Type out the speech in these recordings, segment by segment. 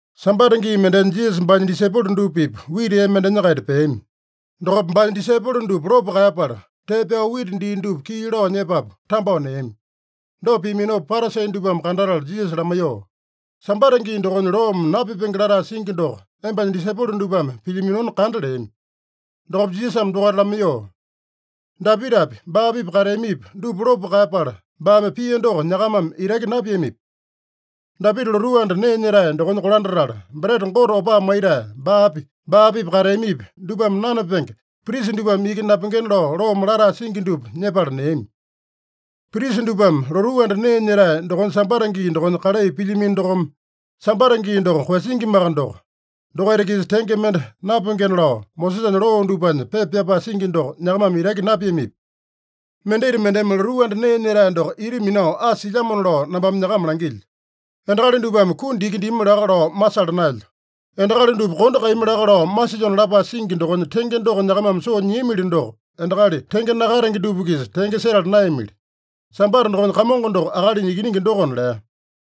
Sambata gii mendenya Jisasa baanya disaipolo dupa-pipa wita ee mendenya-kaita peami. Dokopa baanya disaipolo dupa lopo kaeyapala, tee pyao wita dii dupa kii lao nyepapu tambao neami. Dopa piaminopa Parasi dupame kandatala Jisasa lamaiyoo, “Sambata gii dokonya loome napipenge latae singi doko embanya disaipolo dupame pilyaminona kanda” leami. Dokopa Jisasame dokaita lamaiyoo, “Dapitapi, baa-pipa kateamipi, dupa lopo kaeyapala, baame pia doko nyakamame itaki napiamipi? Dapita lotuu anda nee nyetae dokonya kolandatala, breta Gote opaa maitae, baapi, baa-pipa kateamipi, dupame nanapenge, prisa dupame iki napengena lao loome latae singi dupa nyepala neami. Prisa dupame lotuu anda nee nyetae dokonya Sambata gii dokonya kalai pilyamino dokome, Sambata gii doko koeyasingimaka doko, dokaita-kisa tenge mende napengena lao Mosesanya loo dupanya pepa pyapae singi doko nyakamame itaki napiamipi? Mendita mendeme lotuu anda nee nyetae doko ita minao asa silyamona lao nambame nyakama langilyo. ‘Endakali dupame kundi iki dimi laka lao masala naelyo. Endakali dupa kondo kaeyami laka lao masilyona’ lapae singi dokonya tenge doko nyakamame soo nyiamili doko, endakali tenge nakatenge dupa-kisa tenge setala naeyamili. Sambata dokonya Kamongo doko Akalinya Ikiningi dokona” lea.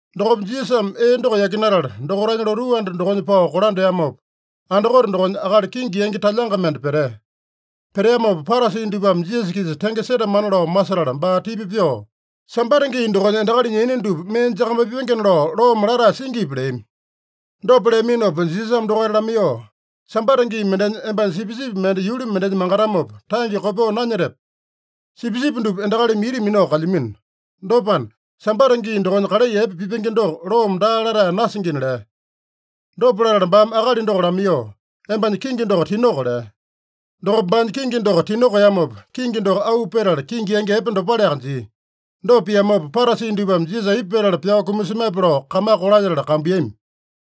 Dokopa Jisasame ee doko yakinatala, dokaitanya lotuu anda dokonya pao kolandeamopa, andakote dokonya akali kingi yangi talyanga mende petea. Peteamopa, Parasi dupame Jisasa-kisa tenge setamana lao masetala, baa tipa pyoo, “Sambata gii dokonya endakalinya yaina dupa mee jakamaipengena lao loome latae singipi?” leami. Dopa leaminopa Jisasame dokaita lamaiyoo, “Sambata gii mendenya, embanya sipisipi mende yuli mendenya mangatamopa, tange kopyoo nanyetepe? Sipisipi dupa endakalimi ita minao kalyamino. Dopana, Sambata gii dokonya kalai epe pipenge doko loome daa latae nasingina” lea. Dopa latala baame akali doko lamaiyoo, “Embanya kingi doko tinoko” lea. Dokopa baanya kingi doko tinokeamopa, kingi doko auu petala kingi yangi epe dopaleaka jia. Dopa piamopa, Parasi dupame Jisasa aipa petala pyao kumasemape lao kamaka kolalyetala kambuiyami.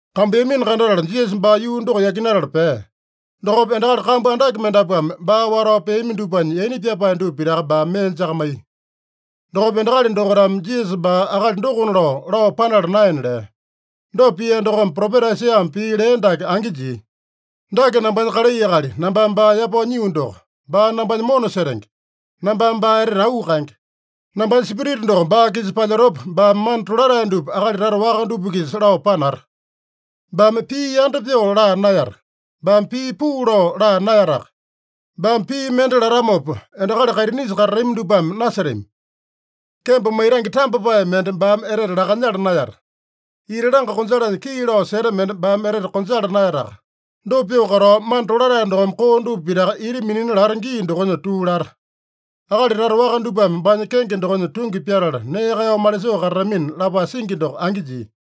Kambuiyamino kandatala, Jisasa baa yuu doko yakinatala pea. Dokopa endakali kambu andake mendapuame baa watao peami dupanya yaina pyapae dupa pitaka baame mee jakamaiya. Dokopa endakali dokaitame Jisasa baa akali dokona lao, lao panala naena lea. Dopa pia dokome, propeta Aisaiyame pii lea dake angi jia: “Dake nambanya kalai akali, nambame baa yapao nyio doko. Baa nambanya mona setenge. Nambame baa etete auu kaenge. Nambanya Spirita doko baa-kisa palyetopa, baame mana tolatae dupa akali tata waka dupa-kisa lao panata. Baame pii yanda pyoo laa naeyata. Baame pii puu lao laa naeyataka. Baame pii mende latamopa, endakali kaitinisa katatami dupame nasetami. Kembo maitange tambapae mende baame etete lakanyala naeyata. Ita langa konjalanya kii lao seta mende baame etete konjala naeyataka. Dopa pyoo katao, mana tolatae dokome koo dupa pitaka ita minina lata gii dokonya tuu lata. Akali tata waka dupame baanya kenge dokonya tungi pyatala nee kaeyao malisoo katatamina” lapae singi doko angi jia.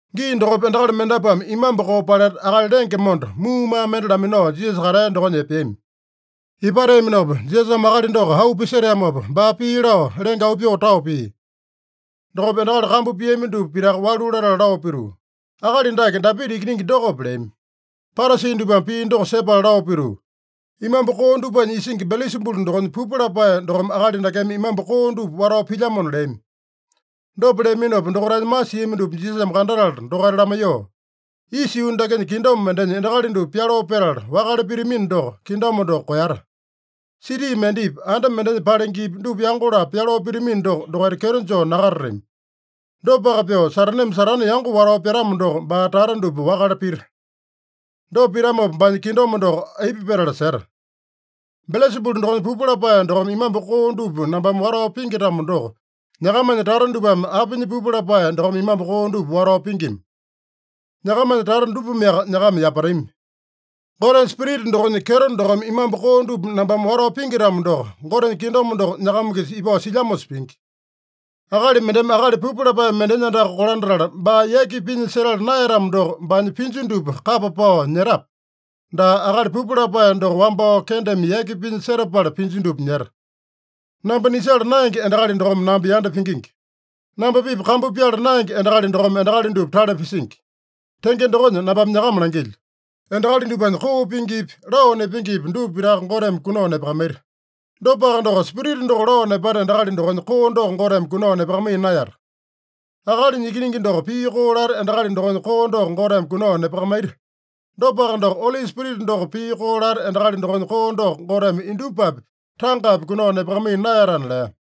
Gii dokopa endakali mendapuame imambu koo paleta, akali lenge monda, muumaa mende laminao Jisasa katea dokonya epeami. Ipateaminopa, Jisasame akali doko auu piseteamopa, baa pii lao, lenge auu pyoo tao pia. Dokopa endakali kambu piami dupa pitaka walu latala lao pituu, “Akali dake Dapita Ikiningi dokope?” leami. Parasi dupame pii doko sepala lao pituu, “Imambu koo dupanya isingi Belesabulu dokonya pupu lapae dokome akali dakeme imambu koo dupa watao pilyamona” leami. Dopa leaminopa, dokaitanya masiami dupa Jisasame kandatala dokaita lamaiyoo, “Isa yuu dakenya kingdom mendenya endakali dupa pyaloo petala wakale pitamino doko, kingdom doko koeyata. Siti mendepi, anda mendenya palengepi, dupa yango-lapo pyaloo pitamino doko, dokaita kyeto joo nakatatami. Dopaka pyoo, Sataneme Satane yango watao pyatamo doko, baa tata dupa wakale pita. Dopa pitamopa, baanya kingdom doko aipa petala seta? Belesabulu dokonya pupu lapae dokome imambu koo dupa nambame watao pingi-tamo doko, nyakamanya tata dupame apinya pupu lapae dokome imambu koo dupa watao pingima? Nyakamanya tata dupameaka nyakama yapatami. Gotenya Spirita dokonya kyeto dokome imambu koo dupa nambame watao pingi-tamo doko, Gotenya kingdom doko nyakama-kisa ipao silyamosa pingi. Akali mendeme akali pupu lapae mendenya andaka kolandatala baa yaki pinya setala naeyatamo doko, baanya pinju dupa kapa pao nyetape? Daa, akali pupu lapae doko wambao kendeme yaki pinya setapala pinju dupa nyeta. Namba nisala naenge endakali dokome namba yanda pingingi. Namba-pipa kambu pyala naenge endakali dokome endakali dupa tale pisingi. Tenge dokonya nambame nyakama langilyo: Endakali dupanya koo pingipi, lao nepengepi, dupa pitaka Goteme kunao nepakamaita. Dopaka doko, Spirita doko lao nepata endakali dokonya koo doko Goteme kunao nepakamaiya naeyata. Akalinya Ikiningi doko pii koo lata endakali dokonya koo doko Goteme kunao nepakamaita. Dopaka doko, Oli Spirita doko pii koo lata endakali dokonya koo doko Goteme indupapi, tangapi kunao nepakamaiya naeyatana” lea.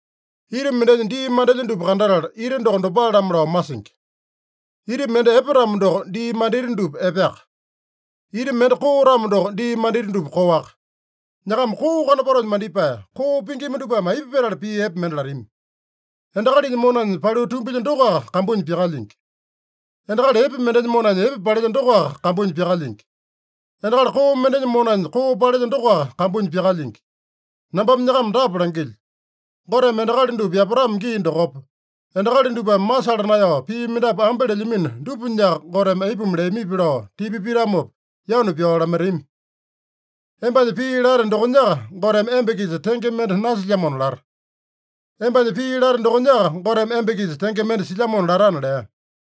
“Ita mendenya dii mandelya dupa kandatala, ita doko dopale-lamo lao masingi. Ita mende epe-tamo doko, dii mandita dupa epeaka. Ita mende koo-tamo doko, dii mandita dupa koaka. Nyakama koo kanopatonya mandipae, koo pingima dupame aipa petala pii epe mende latami? Endakalinya monanya paliu tumbilya dokoaka kambunya pyakalyingi. Endakali epe mendenya monanya epe palelya dokoaka kambunya pyakalyingi. Endakali koo mendenya monanya koo palelya dokoaka kambunya pyakalyingi. Nambame nyakama dapa langilyo: Goteme endakali dupa yapatamo gii dokopa, endakali dupame masala naeyao pii mendapu ambe lelyamino dupanyaka, Goteme aipuma leamipi lao tipa pitamopa, yanu pyao lamaitami. Embanya pii late dokonyaka, Goteme emba-kisa tenge mende nasilyamona lata. Embanya pii late dokonyaka, Goteme emba-kisa tenge mende silyamona latana” lea.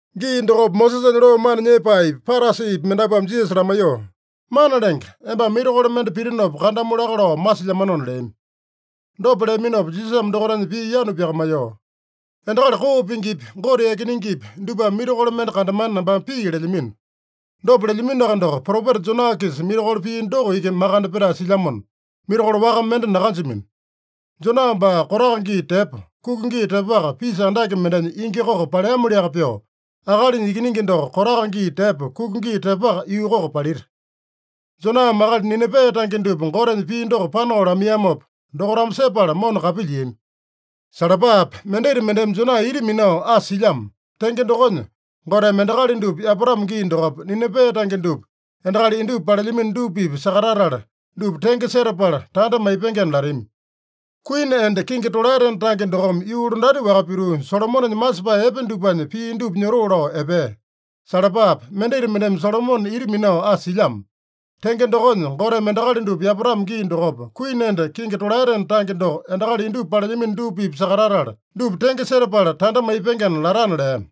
Gii dokopa Mosesanya loo mana nyepaepi, Parasipi mendapuame Jisasa lamaiyoo, “Mana Lenge, embame mirakolo mende pitinopa kandamu laka lao masilyamanona” leami. Dopa leaminopa Jisasame dokaitanya pii yanu pyakamaiyoo, “Endakali koo pingipi, Gote yakinengepi dupame mirakolo mende kandamana nambame pii lelyamino. Dopa lelyaminoaka doko, propeta Jona-kisa mirakolo pia doko iki makande petae silyamona, mirakolo waka mende nakanjamino. Jona baa kotaka gii tepo, kuka gii tepoaka, pisa andake mendenya ingi koko paleamoliaka pyoo, Akalinya Ikiningi doko, kotaka gii tepo, kuka gii tepoaka, yuu koko palita. Joname akali Ninipe tange dupa Gotenya pii doko panao lamaiyamopa, dokaitame sepala mona kapilyiami. Salapape! Mendita mendeme Jona ita minao asa silyamo. Tenge dokonya, Goteme endakali dupa yapatamo gii dokopa, Ninipe tange dupa endakali indupa palelyamino dupa-pipa sakatatala, dupa tenge setapala tanda maipengena latami. Kuini enda kingi tolaetena tange dokome yuu londati-waka pituu, Solomonenya masepae epe dupanya pii dupa nyotoo lao epea. Salapape! Mendita mendeme Solomone ita minao asa silyamo. Tenge dokonya, Goteme endakali dupa yapatamo gii dokopa, kuini enda kingi tolaetena tange doko endakali indupa palelyamino dupa-pipa sakatatala, dupa tenge setapala tanda maipengena latana” lea.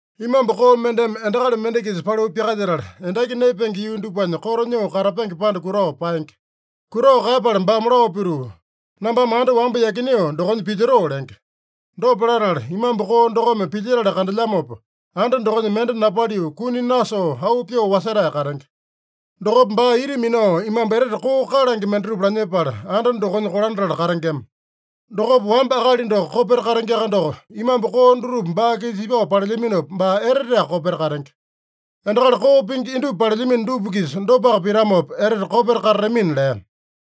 “Imambu koo mendeme endakali mende-kisa paliu pyakalyetala, endaki naepenge yuu dupanya koto nyoo katapenge panda kutao paenge. Kutao kaeyapala baame lao pituu, ‘Nambame anda wamba yakineo dokonya pilyotoo’ lenge. Dopa latala, imambu koo dokome pilyetala kandelyamopa, anda dokonya mende napaliu, kuni nasoo, auu pyoo wasetae katenge. Dokopa baa ita minao imambu etete koo kalange mendatupa lanyepala, anda dokonya kolandatala katengema. Dokopa, wamba akali doko kopeta katengeaka doko, imambu koo dutupa baa-kisa ipao palelyaminopa, baa eteteaka kopeta katenge. Endakali koo pingi indupa palelyamino dupa-kisa dopaka pitamopa, etete kopeta katatamina” lea.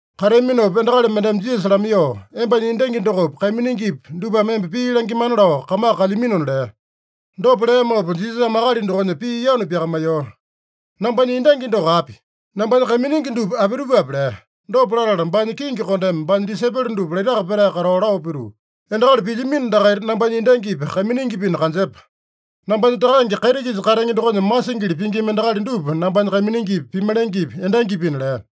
Kateaminopa endakali mendeme Jisasa lamaiyoo, “Embanya endangi dokopi, kaiminingipi dupame emba pii langimana lao kamaka kalyaminona” lea. Dopa leamopa Jisasame akali dokonya pii yanu pyakamaiyoo, “Nambanya endangi doko api? Nambanya kaiminingi dupa apitupape?” lea. Dopa latala, baanya kingi kondeme baanya disaipolo dupa laitaka petae katao lao pituu, “Endakali pilyamino dakaita nambanya endangipi, kaiminingipina kanjepa. Nambanya Takange kaiti-kisa katenge dokonya masingili pingima endakali dupa nambanya kaiminingipi, pimalengepi, endangipina” lea.